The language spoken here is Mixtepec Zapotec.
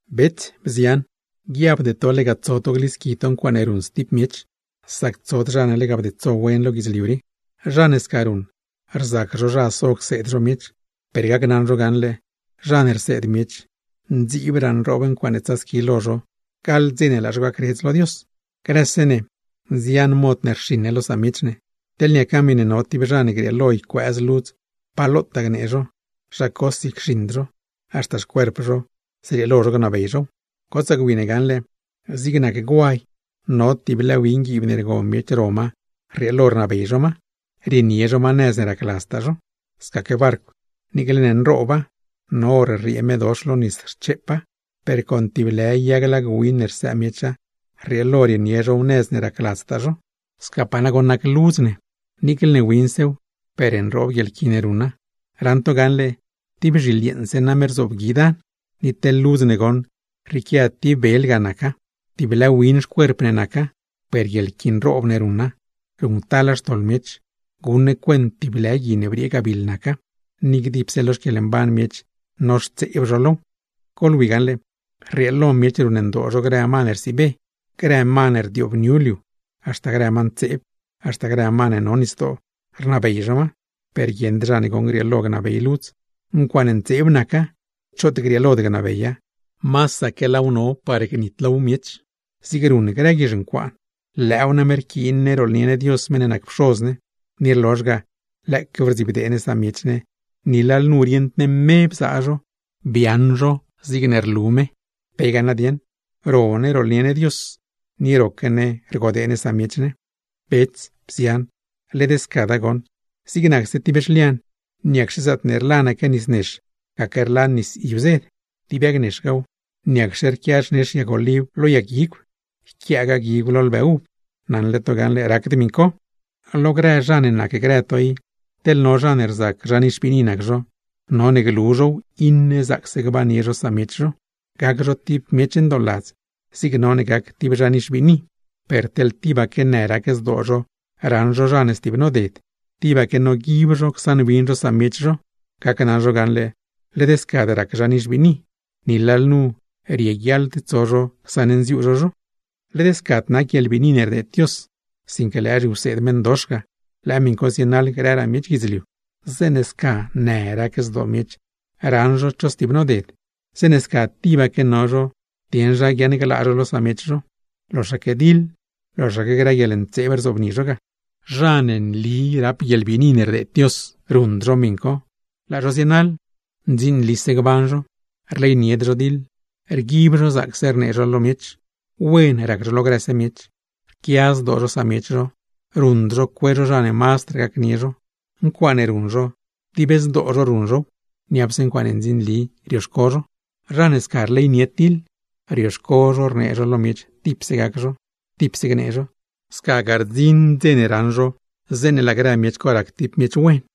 Bets, bzian, guiabde to lega tso to glisqui to ncuaaṉe ruṉ stib miech, sac tsod zha ne demaste wen lo guidzliu rii. Zha ne sca ruṉ, rzac zho zha so cseed zho miech, per gacnaṉ zho gaṉle zha ne rseed miech, mazdraa nroob ncuaaṉe tsasqui lo zho gaḻ dze ne laa zho gacredz lo Dios. Grëse ne nzian mod ne rxiṉ ne lo samiech ne. Teḻ niaca miṉe no tib zha ne grieelo ycuëëz ludz pa lotaa gnee zho, zha cosi cxiṉd zho, haxta xcuerp zho zrieelo zho gnabey zhow. Gotsaa gwi ne gaṉle zig nac guay, con tib lë win guiib ne rgo miech ro ma rrieelo rnabey zho ma, rienie zho ma nëz ne racladztaa zho. Scaque barcw, niicle ne nrooba, no hor rriee medox lo nis rcheepa, per con tib lë yag lag win ne rsëë miecha, rrieelo rienie zhow nëz ne racladztaa zho. Scapaa nagoṉ nac ludz ne; niicle ne winsew, per nroob guieḻqui ne ruṉa. ¡Ran to gaṉle tib bzhiḻ yeeṉse name rzobgui dan! Ni teḻ ludz ne goṉ, rrieequia tib bel ga naca. Tib lë win xcuerp ne naca, per guieḻqui nroob ne ruṉa, ruṉctala xtoḻ miech. Guṉ ne cuent tib lë gui ne briee gabiḻ naca; ni dipse lo xquieḻmban miech noxtseeb zho low. Goḻwi gaṉle, rrieelo miech ruṉndoo zho grë ma ne rsiibe, grë ma ne rzëleṉ liu, haxta grë ma ntseeb, haxta grë ma ne no nisdoo, rnabey zho ma. Per guieṉd zha ne goṉ grieelo gnabey ludz; ncuaaṉe ntseeb naca, choot grieelod gnabeya; masaque laaw no par gnitlow miech, zigne ruṉ grë guizh ncuaan. Lëëw name rquiin ne rooḻnie ne Dios meṉ ne nac Pxoz ne, ni rlozh ga lëëquew rdzibdee ne samiech ne, ni lalnu rieṉd ne me bzaa zho, biaaṉ zho zigne rlu me. ¿Pe ga nadieṉ, ro ne rooḻnie ne Dios, ni roque ne rgodee ne samiech ne? Bets, bzian, led scada goṉ. Zig nacse tib zhlian, ¿niacxe zaatne rlanaque nis nex gaque rlan nis yuzed? Tib yag nexgaaw, ¿niacxe rquia xnex yag oliv lo yag guigw, yquiaagaa guigw lo lbë uv? Naṉle to gaṉle racd miṉ co. Lo grë zha ne nacgrë to i, teḻ no zha ne rzac zha nixbiini nac zho, none glu zhow iṉe zaacse gbannie zho samiech zho, gac zho tib miech ndooladz zig none gac tib zha nixbiini. Per teḻ tibaque në rac zdoo zho raṉ zho zha ne stib noded, tibaque noguib zho csaṉwin zho samiech zho; gacnaṉ zho gaṉle, led scad rac zha nixbiini. Ni lalnu rieguiaḻd tso zho csaṉnziuu zho zho. Led scad nac guieḻbiini ne rdeed Dios, sinque lëë zhiwseed meṉdox ga, lëë miṉ co zienaḻ grëraa miech guidzliu. Zeeṉe sca në rac zdoo miech raṉ zho cho stib noded, zeeṉe sca tibaque no zho dieṉ zha guiaṉglaa zho lo samiech zho, loxaque diḻ, loxaque grë guieḻntseeb rzobni zho ga. Zha ne nli rap guieḻbiini ne rdeed Dios, ruṉd zho miṉ co, laa zho zienaḻ: ndzinlise gban zho, rleynied zho diḻ, rguib zho zaacse rnee zho lo miech, wen rac zho lo grëse miech, rquia zdoo zho samiech zho, ruṉd zho cue zho zha ne mazdraa gacnie zho, ncuaaṉe ruṉ zho dib zdoo zho ruṉ zhow, niapse ncuaaṉe ndzinli rioxco zho. Zha ne sca rleynied diḻ, rioxco zho rnee zho lo miech tipse gac zho, tipse gnee zho; scagaa rdziṉ dze ne raṉ zho zeeṉe laa grë miech co rac tib miech wen.